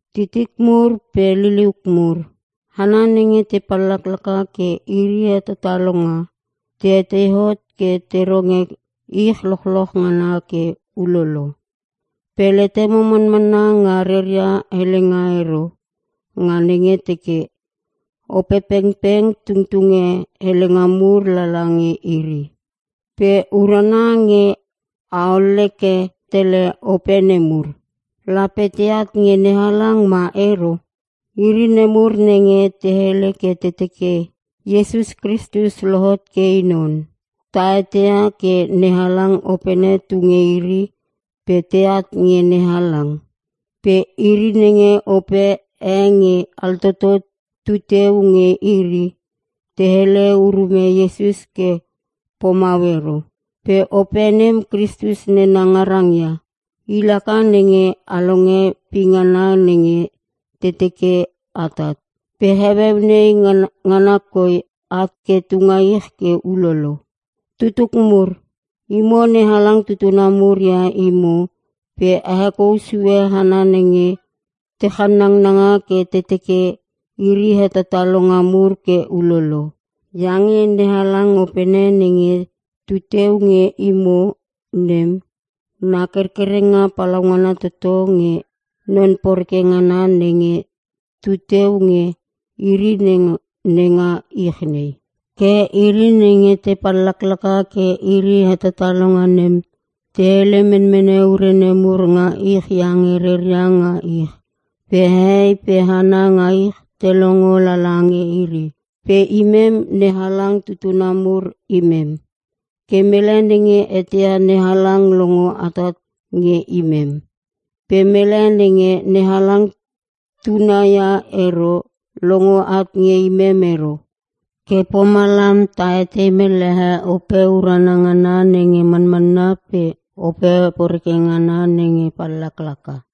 Titik mur pe liliuk mur, hana nenge te pallaklaka ke iri hetatalonga, tei hot ke te ronge ich lochloch ngana ke ulolo. Pe letemo manmanna nga reria helenga ero nga nenge te teke, Opepengpeng tungtunge helenga mur lala nge iri. Pe urana nge a olleke tele ope nemur. Lape teat nge NeHalang ma ero? Iri nemur nenge te hele ke te teke Iesus Kristus lohot ke I non, ta eteia ke NeHalang Opene tu nge iri pe teat nge NeHalang. Pe iri nenge ope e nge altoto tu teu nge iri, te hele urume Iesus ke pomau ero. Pe ope nem Kristus nena ngarang ia. I laka nenge a longe pingana nenge te teke atat. Pe heueu nei ngana koi at ke tunga ich ke ulolo. Tutuk mur, imo NeHalang tutuna mur ia imo pe a hekou sue hana nenge te channangnanga ke te teke iri hetatalonga mur ke ulolo. Iange NeHalang Opene nenge tu teu nge imo nem na kerkerenga palaungana toto nge non poreke ngana nenge tu teu nge iri nenga ich nei. Ke iri nenge te pallaklaka ke iri hetatalonga nem, te hele menmene ure nemur nga ich iange reria nga ich, pe hehei pe hana nga ich te longo lala nge iri. Pe imem, NeHalang tutuna mur imem. Ke mele nenge eteia NeHalang longo atat nge imem. Pe mele nenge NeHalang tuna ia ero longo at nge imem ero. Ke pomalam ta etei mellehe Ope urana ngana nenge manmanna pe ope poreke ngana nenge pallaklaka.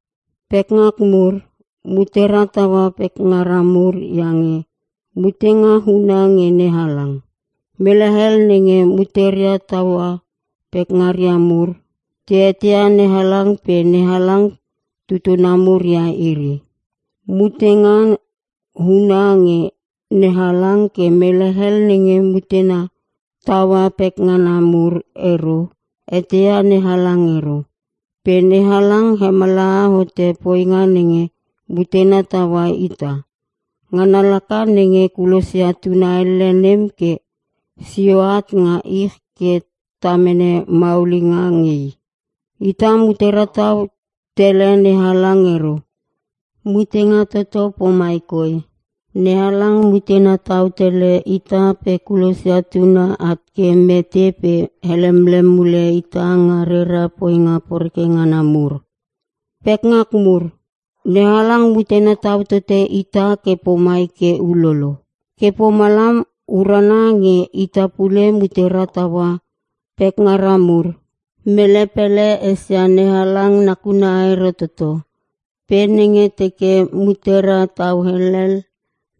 Pekngak mur, mutera taua pekngara mur iange mutenga huna nge NeHalang. Mele hel nenge muteria tautaua pekngaria mur te eteia NeHalang pe NeHalang tutuna mur ia iri. Mutenga huna nge NeHalang ke mele nenge mutena taua pekngana mur ero eteia NeHalang ero. Pe NeHalang hemallaha hote poinga nenge mutena taua ita. Ngana laka nenge kulosia Tuna elle nem ke sio at nga ich ke ta mene maulinga nge I. Ita mutera tau tele NeHalang ero. Mutenga toto pomai koi: NeHalang mutena tau tele ita pe kulosia Tuna at ke mete pe helemlem mule ita nga rera poinga poreke ngana mur. Pekngak mur, NeHalang mutena tau tote ita ke pomai ke ulolo. Ke pomalam urana nge ita pule mutera taua pekngara mur. Mele pele esia NeHalang nakuna ero toto. Pe nenge teke mutera tau helel,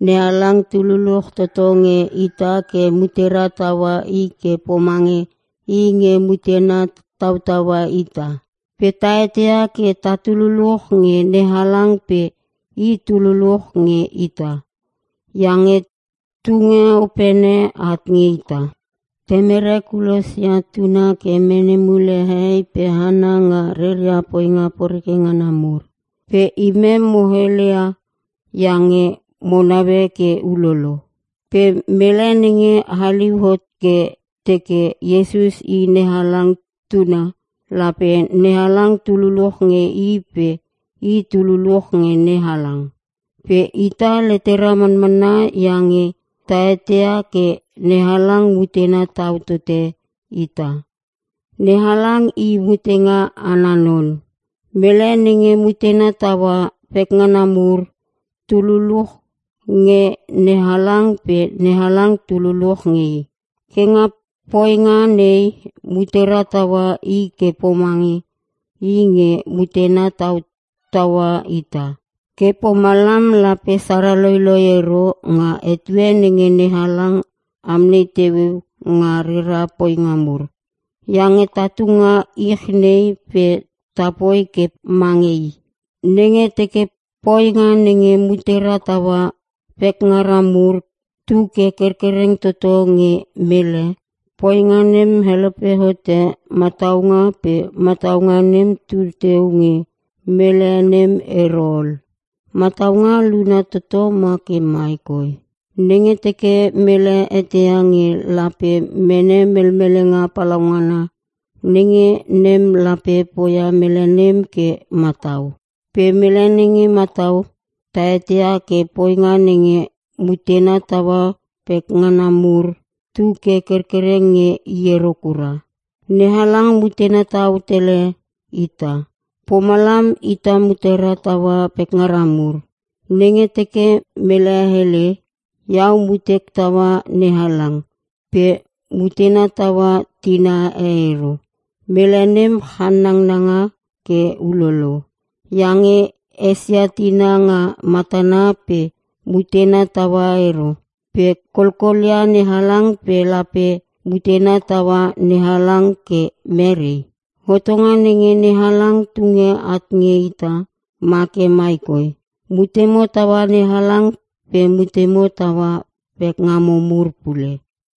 NeHalang tu luluch toto nge ita ke mutera taua I ke pomange I nge mutena tautaua ita. Pe ta eteia ke tatu luluch nge NeHalang pe I tu luluch nge ita, iange tunge Opene at nge ita. Temere kulosia Tuna ke mene mule hehei pe hana nga reria poinga poreke ngana mur. Pe imem mo heleia iange mo naue ke ulolo. Pe mele nenge haliu hot ke teke Iesus I NeHalang Tuna, lape NeHalang tu luluch nge i pe i tu luluch nge NeHalang. Pe ita letera manmanna iange ta eteia ke NeHalang mutena tau tote ita. NeHalang I Mutenga ana Non. Mele nenge mutena taua pekngana mur tu luluch nge NeHalang pe NeHalang tu luluch nge i. Ke nga poinga nei mutera taua I ke pomange I nge mutena tautaua ita. Ke pomalam lape sara loiloi ero nga etue nenge NeHalang amnei teueu nga rera poinga mur. Iange tatu nga ich nei pe ta poi ke mange I. Nenge teke poinga nenge mutera taua pekngara mur tu ke kerkereng toto nge mele, poinga nem helope hote mataunga pe mataunga nem tu teu nge mele nem ero ol. Mataunga luna toto ma ke mai koi: Nenge teke mele eteia nge lape mene melmelenga palaungana, nenge nem lape poia mele nem ke matau. Pe mele nenge matau, ta eteia ke poinga nenge mutena taua pekngana mur tu ke kerkereng nge i ero kura. NeHalang mutena tau tele ita. Pomalam ita mutera taua pekngara mur. Nenge teke mele hele, “Iau mutek taua NeHalang” pe mutena taua tina ero, mele nem channanga ke ulolo. Iange i esia tina nga matana pe mutena taua ero. Pe kolkolia NeHalang pe lape mutena taua NeHalang ke merei? Hotonga nenge NeHalang tunge at nge ita ma ke mai koi; “Mutemo taua NeHalang pe mutemo taua pekngamo mur pule!”